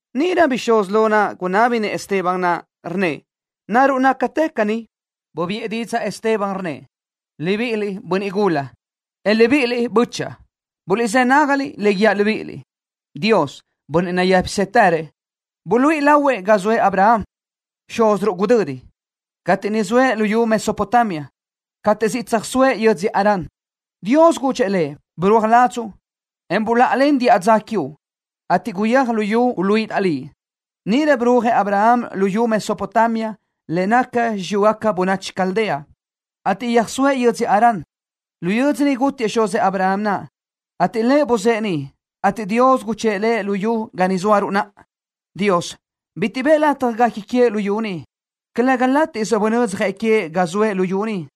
Níʼirö bixúz lo gunábinëʼ Esteban naʼ, rnnëʼ: —¿Naruʼ nácatë caní? Bubiʼë didzaʼ Esteban, rnnëʼ: —Libiʼiliʼ, bönniʼ gula, en libíʼiliʼ, bö́chaʼa. Buliʼzë́ nágaliʼ le guíaʼ libíʼiliʼ. Dios, Bönniʼ nayë́pisëtërëʼ, buluíʼi lahuëʼ ga zoëʼ Abraham, xúziruʼ gudödi, cateʼ niʼ zoëʼ luyú Mesopotamia, cateʼ siʼ tsöjsóëʼ yödzö Harán. Dios gudxëʼ lëʼ: “Birúaj ladzuʼ, en buláʼalen diʼa dza quiuʼ, ateʼ guyéaj luyú niʼ uluíʼidaʼ liʼ.” Níʼirö birúajëʼ Abraham luyú Mesopotamia le naca xiyúgaca bönachi Caldea, ateʼ yöjsóëʼ yödzö Harán. Lu yödzö niʼ gútiëʼ xuzëʼ Abraham naʼ, ateʼ lëʼ buzë́ʼë niʼ, ateʼ Dios guchë́ʼë lëʼ luyú ga ni zóaruʼ naʼa. Dios bitiʼ bëʼë lëʼ lataj guequi queëʼ luyú ni. Calëga látiʼsö bunödzjëʼ queëʼ ga soëʼ luyú ni,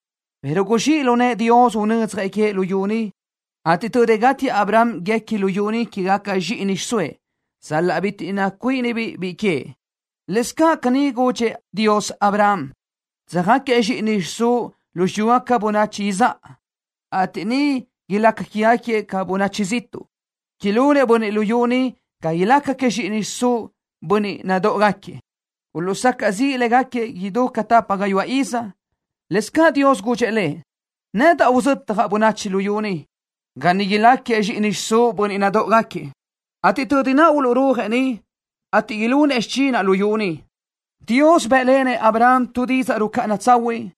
pero guzxíʼ lu nëʼë Dios unödzjëʼ queëʼ luyú ni, ateʼ tödi gátiëʼ Abraham guequi luyú ni quégaca zxíʼini xiʼsóëʼ, sal-laʼ bitiʼ nacuíʼinibiʼ biʼi queëʼ. Lëscaʼ caní Dios gudxëʼ Abraham: “Tsöjáquiëʼ zxíʼini xiʼsúʼ lu xiyúgaca bönachi izáʼa, ateʼ niʼ ilácagaquiëʼ ca bönachi ziʼtuʼ. Ilunëʼ bönniʼ luyú niʼ ga ilácagaquiëʼ zxíʼini xiʼsúʼ bönniʼ nadóʼogaquiëʼ. Uluʼsacaʼ ziʼë légaquiëʼ idú ca tapa gayuáʼ iz.” Lëscaʼ Dios gudxëʼ lëʼ: “Nedaʼ uzötjaʼ bönachi luyú niʼ, ga niʼ ilácagaquiëʼ zxíʼini xiʼsúʼ bönniʼ nadóʼogaquiëʼ, ateʼ tödi niʼ uluʼrúajëʼ niʼ, ateʼ ilunëʼ xichinaʼ luyú ni.” Dios bénlenëʼ Abraham tu didzaʼ rucáʼana tsahuiʼ,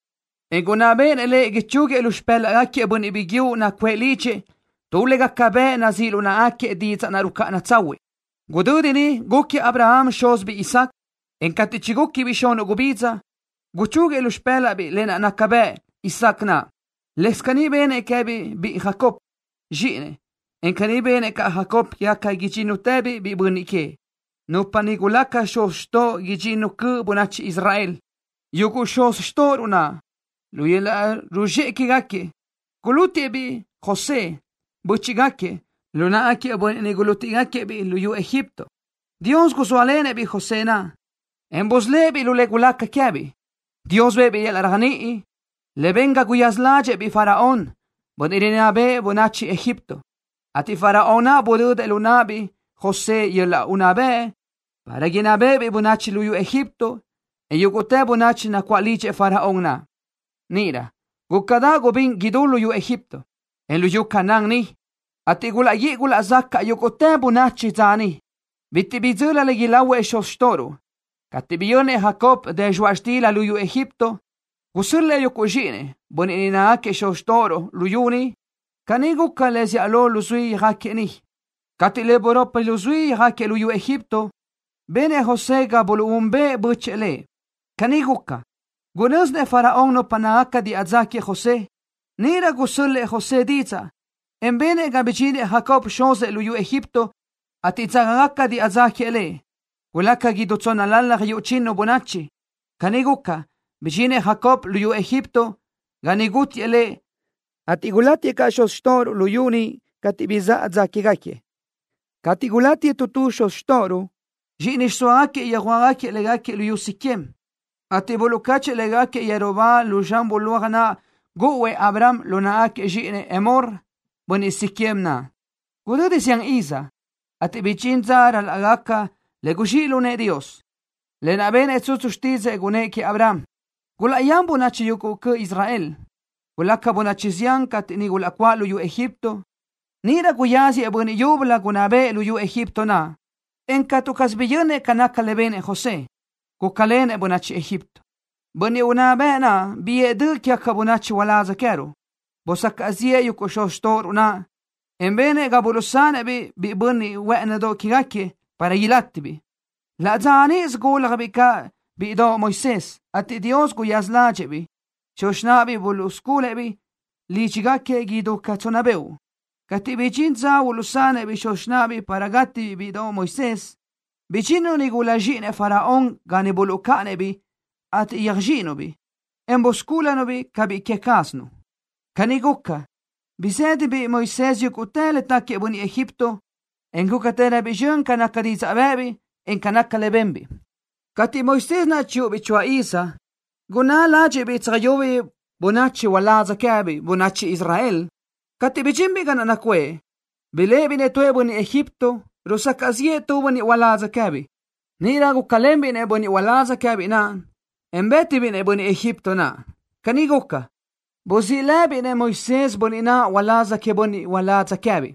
en gunná béʼenëʼ lëʼ ichúguiëʼ lu xipë́laʼgaquiëʼ bönniʼ biguiúʼ nacuʼë lidxëʼ tu le gaca bëʼ nazíʼ lu náʼagaquiëʼ didzaʼ naʼ rucáʼana tsahuiʼ. Gudödi niʼ gúquiëʼ Abraham xúzibiʼ biʼi Isaac, en cateʼ chigúquibiʼ xunuʼ gubidza, guchúguiëʼ lu xipë́laʼbiʼ lë naʼ naca bëʼ. Isaac naʼ, lëscaʼ caní benëʼ queë́biʼ biʼi Jacob, zxíʼinëʼ, en caní benëʼ caʼ Jacob quégaca idxínnutëbiʼ biʼi bönniʼ queëʼ, nupa niʼ gulaca xuz xtóʼogaca idxinnu cöʼ bönachi Israel. ’Yuguʼ xuz xtóʼoruʼ naʼ, lu yöl-laʼ ruzxéʼe quégaquiëʼ, gulútiʼë-biʼ biʼi José, bö́chiʼgaquiëʼ, lu náʼagaquiëʼ bönniʼ niʼ gulútiʼgaquiëʼ-biʼ luyú Egipto. Dios guzóalenëʼ-biʼ biʼi José naʼ en busölë́ʼ-biʼ lu le gulaca queë́biʼ. Dios bëʼë-biʼ yöl-laʼ réajniʼi, le ben ga guyaza ládxëʼë-biʼ Faraón, bönniʼ rinná béʼenëʼ bönachi Egipto, ateʼ Faraón naʼ budödëʼ lu náʼabiʼ biʼi José yöl-laʼ unná bëʼ para gunná béʼebiʼ bönachi luyú Egipto, en yúguʼtë bönachi nacuáʼ lidxëʼ Faraón naʼ. ’Níʼirö gúcadaʼ gubín idú luyú Egipto, en luyú Canaán ni, ateʼ gulaʼguíʼi gulaʼzacaʼ yúguʼtë bönachi dza niʼ. Bitiʼ bidzöli le ilahuëʼ xuz xtóʼoruʼ. Cateʼ biyönnëʼ Jacob dë zxoaʼ xtila luyú Egipto, gusö́l-lëʼë yuguʼ zxíʼinëʼ, bönniʼ niʼ nácagaquiëʼ xuz xtóʼoruʼ, luyú niʼ. Caní guca le zíʼalö luzuí yöjáquiëʼ niʼ. Cateʼ le buropi luzuí yöjáquiëʼ luyú Egipto, benëʼ José ga buluʼúnbëʼë bö́chëʼë lëʼ. Caní guca, gunö́zinëʼ Faraón nupa nácagaca diʼa dza queëʼ José. Níʼirö gusö́l-lëʼë José didzaʼ, en benëʼ ga bidxinëʼ Jacob, xuzëʼ, luyú Egipto, ateʼ dzágagaca diʼa dza queëʼ lëʼ. Gulaca idú tsónnalalaj yuʼ chinu bönachi. Caní guca, bidxinëʼ Jacob luyú Egipto, ga niʼ gútiëʼ lëʼ, ateʼ gulátiëʼ caʼ xuz xtóʼoruʼ luyú niʼ cateʼ bizáʼa dza que quéëgaquiëʼ. Cateʼ gulátiëʼ tu tu xuz xtóʼoruʼ, zxíʼini xiʼsóagaquiëʼ yöjuáʼagaquiëʼ légaquiëʼ luyú Siquem, ateʼ niʼ buluʼcáchëʼë légaquiëʼ yeru ba lu zxan bulóaj naʼ gúʼuëʼ Abraham lu náʼagaca zxíʼinëʼ Hemor, bönniʼ Siquem naʼ. ’Gudödi zián iz, cateʼ bidxín dza ral-laʼ gaca le guzxíʼ lu nëʼë Dios, lë naʼ benëʼ tsutsu xtídzëʼë gunëʼ queëʼ Abraham, gulaʼyán bönachi yuguʼ cöʼ Israel, ateʼ gulaca bönachi zián cateʼ niʼ gulaʼcuáʼ luyú Egipto. Níʼirö guyáziëʼ bönniʼ yúbölö gunná bëʼë luyú Egipto naʼ, en catu caz biyönnëʼ ca naca le benëʼ José, gúcalenëʼ bönachi Egipto. Bönniʼ unná bëʼ naʼ biʼë döʼ quégaca bönachi uládz queë́ruʼ. Busacaʼ ziʼë yuguʼ xuz xtóʼoruʼ naʼ, en benëʼ ga buluʼsanëʼ-biʼ biʼi bönniʼ huë́ʼënidoʼ que queë́gaquiëʼ, para ilátibiʼ. Laʼ dza níʼisö gúljabiʼ caʼ bíʼidoʼ Moisés, ateʼ Dios guyaza ládxëʼë-biʼ. Xuz xináʼabiʼ buluʼsculëʼ-biʼ lídxigaquiëʼ idú ca tsonna beoʼ. Cateʼ bidxín dza uluʼsanëʼ-biʼ xuz xináʼabiʼ para gátibiʼ bíʼidoʼ Moisés naʼ, bidxinnu nigula zxíʼinëʼ Faraón ga niʼ buluʼcáʼanëʼ-biʼ, ateʼ yöjzxíʼinu-biʼ, en buscúlunu-biʼ ca biʼi que cázanu. Caní guca, bizë́dabiʼ biʼi Moisés yúguʼtë le táquiëʼ bönniʼ Egipto, en gúcatëröbiʼ zxön ca naca didzaʼ bë́ʼëbiʼ, en ca nácagaca le benbiʼ. ’Cateʼ Moisés naʼ chiyúʼubiʼ choáʼ iz, gunná ládxiʼbiʼ tsöjyubiʼ bönachi uládz queë́biʼ, bönachi Israel. Cateʼ bidxinbiʼ ga naʼ nacuʼë, biléʼebiʼ-nëʼ tu bönniʼ Egipto, rusacaʼ ziʼë tu bönniʼ uládz queë́biʼ. Níʼirö gúcalenbiʼ-nëʼ bönniʼ uládz queë́biʼ naʼ, en bë́tibiʼ-nëʼ bönniʼ Egipto naʼ. Caní guca, buzíʼ labiʼ biʼi Moisés bönniʼ naʼ uláz queëʼ bönniʼ uládz queë́biʼ.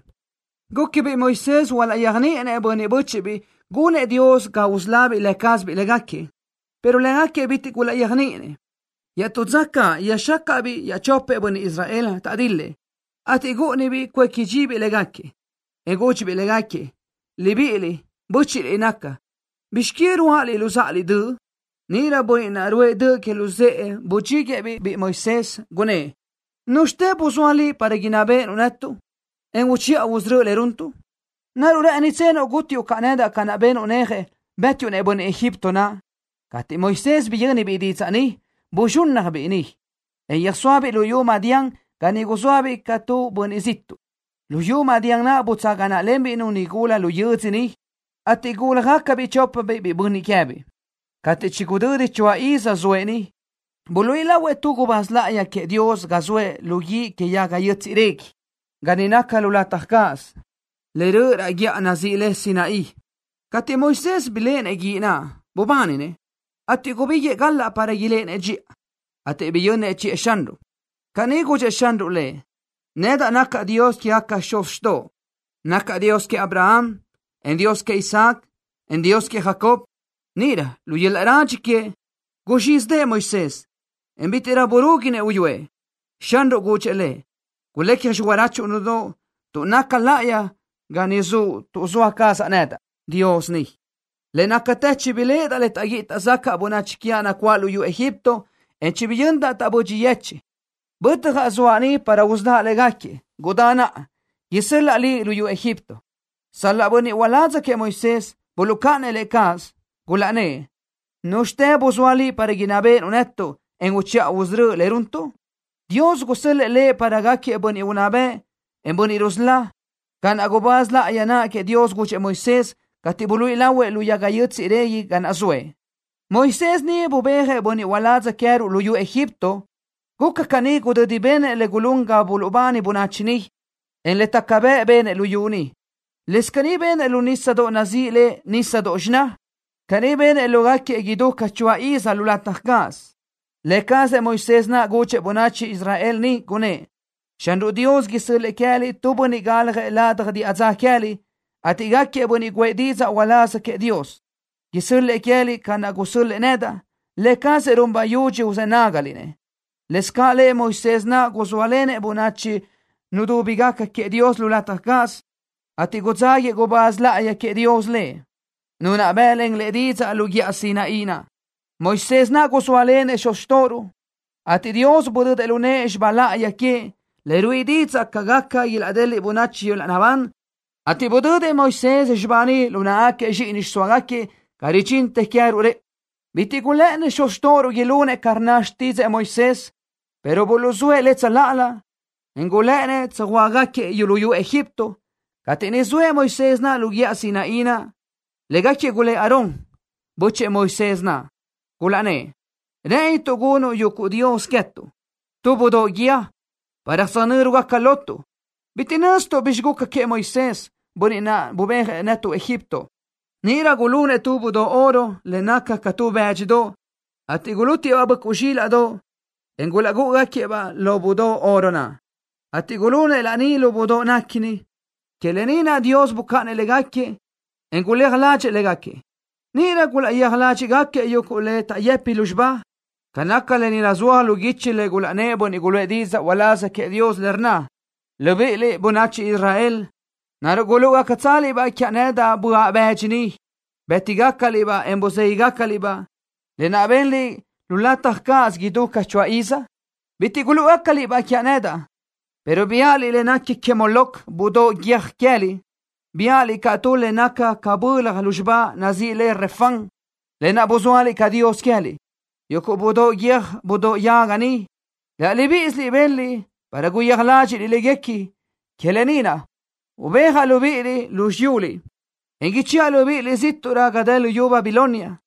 Gúquibiʼ Moisés hualaʼyéajniʼinëʼ bönniʼ bö́chiʼbiʼ gunëʼ Dios ga usölábiʼ lë cázabiʼ légaquiëʼ, pero légaquiëʼ bitiʼ gulaʼyéajniʼinëʼ. Iaʼtú dza caʼ yöjxácaʼbiʼ iaʼchopëʼ bönniʼ Israel, taʼdil-lëʼ, ateʼ gúʼunibiʼ cuéqui dxibiʼ légaquiëʼ, en gúdxibiʼ légaquiëʼ: “Libíʼiliʼ, bö́chiʼliʼ naca. ¿Bizx que ruáʼaliʼ luzáʼaliʼ döʼ?” Níʼirö bönniʼ naʼ ruʼë döʼ que luzë́ʼë budxíguëʼë-biʼ biʼi Moisés, gunnë́ʼ: “¿Núzxitë buzóa liʼ para inná béʼenuʼ netuʼ, en uchiʼa usörö́uʼ le runtuʼ? ¿Naruʼ rë́ʼënitsenuʼ gútiuʼ caʼ nedaʼ ca benuʼ néaje, bë́tiuʼ-nëʼ bönniʼ Egipto naʼ?” Cateʼ Moisés biyö́nibiʼ didzaʼ ni, buzxúnnajbiʼ niʼ, en yöjsóabiʼ luyú Madián ga niʼ guzóabiʼ ca tu bönniʼ ziʼtuʼ. Luyú Madián naʼ butsaga náʼalenbiʼ-nu nigula lu yödzö niʼ, ateʼ gúljagacabiʼ chópabiʼ biʼi bönniʼ queëʼ. ’Cateʼ chigudödi choáʼ iz zoëʼ niʼ, buluíʼi lahuëʼ tu gubáz láʼayi queëʼ Dios ga zoëʼ lu guíʼ que yaga yö́tsiʼdoʼ régui, ga niʼ naca lu lataj cáʼasö, le röʼö raʼ guíʼa nazíʼi le Sinaí. Cateʼ Moisés biléʼenëʼ guíʼ naʼ, bubáninëʼ, ateʼ gubíguiʼë galaʼ para iléʼenëʼ dxiʼa, ateʼ biyönnëʼ chiʼë Xanruʼ. Caní gudxëʼ Xanruʼ lëʼ: “Nedaʼ nacaʼ Dios quégaquiëʼ xuz xtoʼo. Nacaʼ Dios queëʼ Abraham, en Dios queëʼ Isaac, en Dios queëʼ Jacob.” Níʼirö lu yöl-laʼ radxi queëʼ, guzxízidëʼë Moisés, en bítiʼrö burúguinëʼ uyúëʼ. Xanruʼ gudxëʼ lëʼ: “Guléaj xirachuʼ nudóʼo, tuʼ naca láʼayi ga ni zuʼ tuʼ zoa cazaʼ nedaʼ, Dios, ni. Le nácatë chibiléʼedaʼ le taʼguíʼi taʼzacaʼ bönachi quiaʼ nacuáʼ luyú Egipto, en chibiyöndaʼ taʼbödxi yecheʼ. Bötjaʼ, zoaʼ ni para usöláʼ légaquiëʼ. Gudá naʼa, isö́l-laʼa liʼ luyú Egipto.” ’Sal-laʼ bönniʼ uládz queëʼ Moisés, buluʼcáʼanëʼ lëʼ cáʼasö, gulaʼnnë́ʼ: “¿Núzxitë buzóa liʼ para inná béʼenuʼ netuʼ, en uchiʼa usörö́uʼ le runtuʼ?” Dios gusö́l-lëʼë lëʼ para gáquiëʼ bönniʼ unná bëʼ, en bönniʼ rusölá, ca naʼ gubáz láʼayi naʼ queëʼ Dios gudxëʼ Moisés, cateʼ buluíʼi lahuëʼ lu yaga yö́tsiʼdoʼ régui ga naʼ zoëʼ. Moisés ni bubéajëʼ bönniʼ uládz queë́ruʼ luyú Egipto. Guca caní gudödi benëʼ le gulún ga buluʼbani bönachi niʼ, en le taca bëʼ benëʼ luyú niʼ. Lëscaʼ caní benëʼ lu nísadoʼ nazíʼi le Nísadoʼ Xiná. Caní benëʼ lógaquiëʼ idú ca choáʼ iz lu lataj cáʼasö. Lë cazëʼ Moisés naʼ gudxëʼ bönachi Israel niʼ, gunnë́ʼ: “Xanruʼ Dios isö́l-lëʼë queë́liʼ tu bönniʼ galjëʼ ladaj diʼa dza queë́liʼ, ateʼ gáquiëʼ bönniʼ guʼë didzaʼ uláz queëʼ Dios. Isö́l-lëʼë lëʼ queë́liʼ ca naʼ gusö́l-lëʼë nedaʼ. Lë cazëʼ run bayudxi uzë́ nágaliʼ-nëʼ.” Lëscaʼ lë cazëʼ Moisés naʼ guzóalenëʼ bönachi nudúbigaca queëʼ Dios lu lataj cáʼasö, ateʼ gudzáguiëʼ gubáz láʼayi queëʼ Dios lëʼ, Nu naʼ bë́ʼlen lëʼ didzaʼ lu guíʼa Sinaí naʼ. Moisés naʼ guzóalenëʼ xuz xtóʼoruʼ, ateʼ Dios budödëʼ lu nëʼë xibá láʼayi queëʼ, le ruíʼi didzaʼ ca gaca ilaʼdeliʼ bönachi yöl-laʼ naʼbán, ateʼ budödëʼ Moisés xibá ni lu náʼagaca zxíʼini xiʼsóagaquiëʼ ga ridxintë queë́ruʼ rëʼu. ’Bitiʼ gulë́ʼënnëʼ xuz xtóʼoruʼ ilunëʼ ca rnna xtídzëʼë Moisés, pero buluʼzóëʼ lëʼ tsöláʼalö, en gulë́ʼënnëʼ tsöjhuö́jgaquiëʼ luyú Egipto. Cateʼ niʼ zoëʼ Moisés naʼ lu guíʼa Sinaí naʼ, légaquiëʼ gulë́ʼ Aarón, bö́chëʼë Moisés naʼ, gulaʼnnë́ʼ: “Rë́ʼënituʼ gunuʼ yuguʼ dios queë́tuʼ, tu budóʼ guíë, para tsöjnö́rugaca lotuʼ. Bitiʼ nöztuʼ bi guca queëʼ Moisés, bönniʼ naʼ nubéajëʼ netuʼ luyú Egipto.” Níʼirö gulunëʼ tu budóʼ oro le naca ca tu bë́dxidoʼ, ateʼ gulútiëʼ-baʼ böʼcuʼ zxílaʼdoʼ, en gulúʼugaquiëʼ-baʼ lo budóʼ oro naʼ, ateʼ gulunëʼ laní lo budóʼ naʼ núngaquiëʼ. Que lë ni naʼ Dios bucáʼanëʼ légaquiëʼ, en guléaj ládxëʼë légaquiëʼ. Níʼirö gulaʼyéaj ládxiʼgaquiëʼ yuguʼ le taʼyëpi lúzxiba. Ca naca lë ni nazúaj lu guichi le gulaʼnnë́ʼ bönniʼ guluʼë didzaʼ uláz queëʼ Dios, le rnna: Libíʼiliʼ, bönachi Israel, ¿naruʼ gulúʼugacatsaliʼ-baʼ quiaʼ nedaʼ böaʼ bëdxi niʼ bë́tigacaliʼ-baʼ, en buzéguiʼgacaliʼ-baʼ, lë naʼ benliʼ lu lataj cáʼasö idú ca choáʼ iz? Bitiʼ gulúʼugacaliʼ-baʼ quiaʼ nedaʼ, pero biáʼaliʼ le nequi que Moloc, budóʼ guiö́j queë́liʼ. Biáʼaliʼ caʼ tu le naca ca bölaj lúzxiba nazíʼi le Refán, lë naʼ buzóaliʼ ca dios queë́liʼ. Yuguʼ budóʼ guiö́j budóʼ yaga ni, laʼ libíʼisiliʼ benliʼ para guyéaj ládxiʼliʼ léguequi. Que lë ni naʼ, ubéajaʼ libíʼiliʼ lu xiyuliʼ, en ichëʼa libíʼiliʼ zíʼtuʼrö ga dë luyú Babilonia.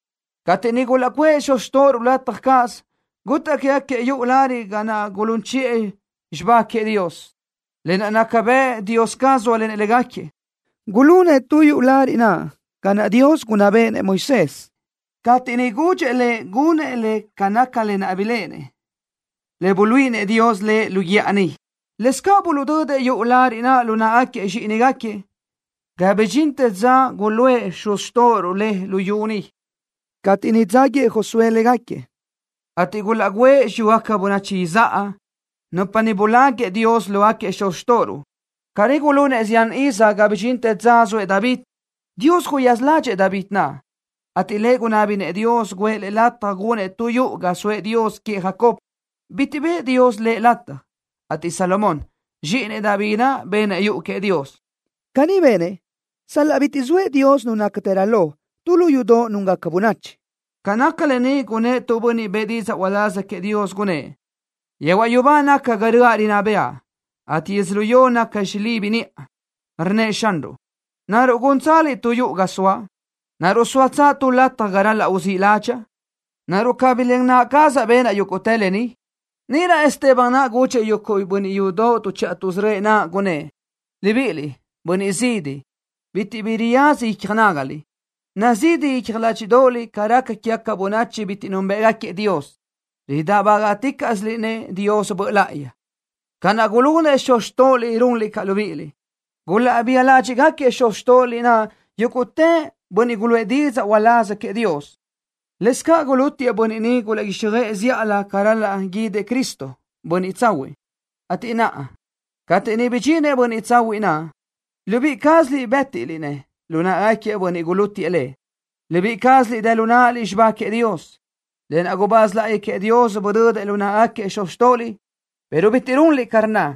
’Cateʼ niʼ gulaʼcuʼë xuz xtóʼoruʼ lu lataj cáʼasö, gutaʼ quégaquiëʼ yuʼu lariʼ naʼ ga gulún chiʼë xibá queëʼ Dios, lë naʼ naca bëʼ Dios caz zóalenëʼ légaquiëʼ. Gulunëʼ tu yuʼu lariʼ naʼ ca naʼ Dios gunná béʼenëʼ Moisés, cateʼ niʼ gudxëʼ lëʼ gunëʼ le ca naca lë naʼ biléʼenëʼ, le buluíʼinëʼ Dios lëʼ lu guíʼa niʼ. Lëscaʼ buluʼdödëʼ yuʼu lariʼ naʼ lu náʼagaquiëʼ zxíʼinigaquiëʼ ga bidxintë dza niʼ guluʼë xuz xtóʼoruʼ le luyú ni, cateʼ niʼ dzáguiëʼ Josué légaquiëʼ, ateʼ gulaʼgǘëʼ xiyúgaca bönachi izáʼa, nupa niʼ buláguiʼë Dios lógaquiëʼ xuz xtóʼoruʼ. Caní gulunëʼ zián iz ga bidxintë dza zoëʼ David. Dios guyaza ládxëʼë David naʼ, ateʼ lëʼ gunábinëʼ Dios guʼë lëʼ lataj gunëʼ tu yuʼu ga soëʼ Dios queëʼ Jacob. Bitiʼ bëʼë Dios lëʼ lataj, ateʼ Salomón, zxíʼinëʼ David naʼ benëʼ yuʼu queëʼ Dios. Caní benëʼ sal-laʼ bitiʼ zoëʼ Dios, Nu nácatërö lo, tu lu yudoʼ núngaca bönachi. Ca naca lë ni gunnë́ʼ tu bönniʼ bëʼë didzaʼ uláz queëʼ Dios, gunnë́ʼ: Yehuaʼ yubá naca ga röʼa rinná bëʼa, ateʼ yödzölió naca xilibi niʼa. Rnnëʼ Xanruʼ: “¿Naruʼ gúntsaliʼ tu yuʼu ga soaʼ? ¿Naruʼ zóatsö tu lataj ga ral-laʼ uzíʼ ládxaʼa? ¿Naruʼ cabí len naʼa cazaʼ benaʼ yúguʼtë lë ni?” Níʼirö Esteban naʼ gudxëʼ yuguʼ bönniʼ yudoʼ tuʼchiʼa tuʼsörö́ëʼ naʼ, gunnë́ʼ: —Libíʼiliʼ, bönniʼ zidi, bitiʼ bi raza icja nágaliʼ. Nazidi icja ládxiʼdoʼoliʼ ca raca quégaca bönachi bitiʼ núnbëʼgaquiëʼ Dios. Ridáʼbagaʼticaʼsiliʼ-nëʼ Dios Böʼ Láʼayi. Ca naʼ gulunëʼ xuz xtóʼoliʼ, runliʼ caʼ libíʼiliʼ. Gulaʼbía ládxiʼgaquiëʼ xuz xtóʼoliʼ naʼ yúguʼtë bönniʼ niʼ guluʼë didzaʼ uláz queëʼ Dios. Lëscaʼ gulútiëʼ bönniʼ niʼ gulaʼguíxjöʼë zíʼalö ca ral-laʼ guídëʼ Cristo, Bönniʼ Tsahuiʼ, ateʼ naʼa, cateʼ niʼ bidxinëʼ Bönniʼ Tsahuiʼ naʼ, libíʼi cázaliʼ bë́tiliʼ-nëʼ lu náʼagaquiëʼ bönniʼ gulútiëʼ Lëʼ. Libíʼi cázaliʼ dë lu náʼaliʼ xibá queëʼ Dios, lë naʼ gubáz láʼayi queëʼ Dios buluʼdödëʼ lu náʼagaquiëʼ xuz xtóʼoliʼ, pero bitiʼ runliʼ ca rnna.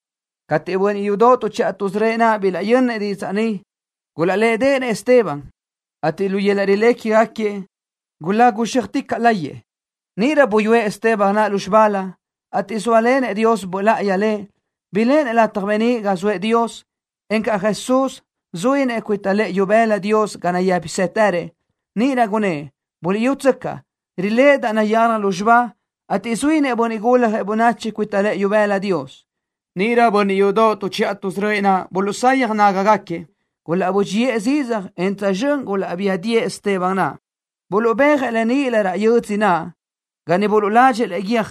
Cateʼ bönniʼ yudoʼ tuʼchiʼa tuʼsörö́ëʼ naʼ bilaʼyönnëʼ didzaʼ ni, gulaʼlédeʼenëʼ Esteban, ateʼ lu yöl-laʼ rilé quégaquiëʼ lëʼ gulagu zxéaticaʼ láyëʼë. Níʼirö buyúëʼ Esteban naʼ lúzxibalö, ateʼ zóalenëʼ Dios Böʼ Láʼayi lëʼ, biléʼenëʼ lataj beníʼ ga zoëʼ Dios, encaʼ Jesús, zuínëʼ cuita lëʼë ibëla Dios ga nayë́pisëtërëʼ. Níʼirö gunnë́ʼ: —Buliʼyútsöcaʼ. Riléʼedaʼ nayalaj lúzxiba, ateʼ zuínëʼ Bönniʼ Guljëʼ Bönachi cuita lëʼë ibëla Dios. Níʼirö bönniʼ yudoʼ tuʼchiʼa tuʼsörö́ëʼ naʼ buluʼsayaj nágagaquiëʼ. Gulaʼbö́dxiʼë zidzaj, en tsözxö́n gulaʼbía diʼë Esteban naʼ. Buluʼbéajëʼ lëʼ níʼilö raʼ yödzö naʼ, ga niʼ buluʼladxëʼ lëʼ guiö́j.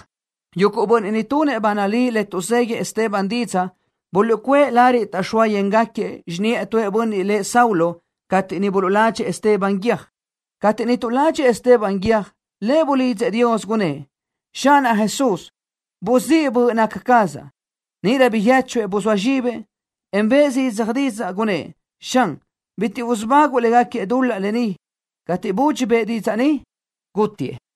Yuguʼ bönniʼ niʼ tunëʼ ba nalí le tuʼzéguíëʼ Esteban didzaʼ buluʼcuʼë lariʼ taʼxóa yéngaquiëʼ xiniʼë tu bönniʼ lëʼ Saulo cateʼ niʼ buluʼladxëʼ Esteban guiö́j. Cateʼ niʼ tuʼladxëʼ Esteban guiö́j, lëʼ bulidzëʼ Dios, gunnë́ʼ: —Xánaʼ Jesús. Buzíʼ böʼ naca cazaʼ. Níʼirö biyéchuëʼ, buzóa zxibëʼ, en bëʼë zidzaj didzaʼ, gunnë́ʼ: —¡Xan! ¡Bitiʼ usubáguʼu légaquiëʼ dul-laʼ ni! Cateʼ budxi bëʼë didzaʼ ni, gútitëʼ.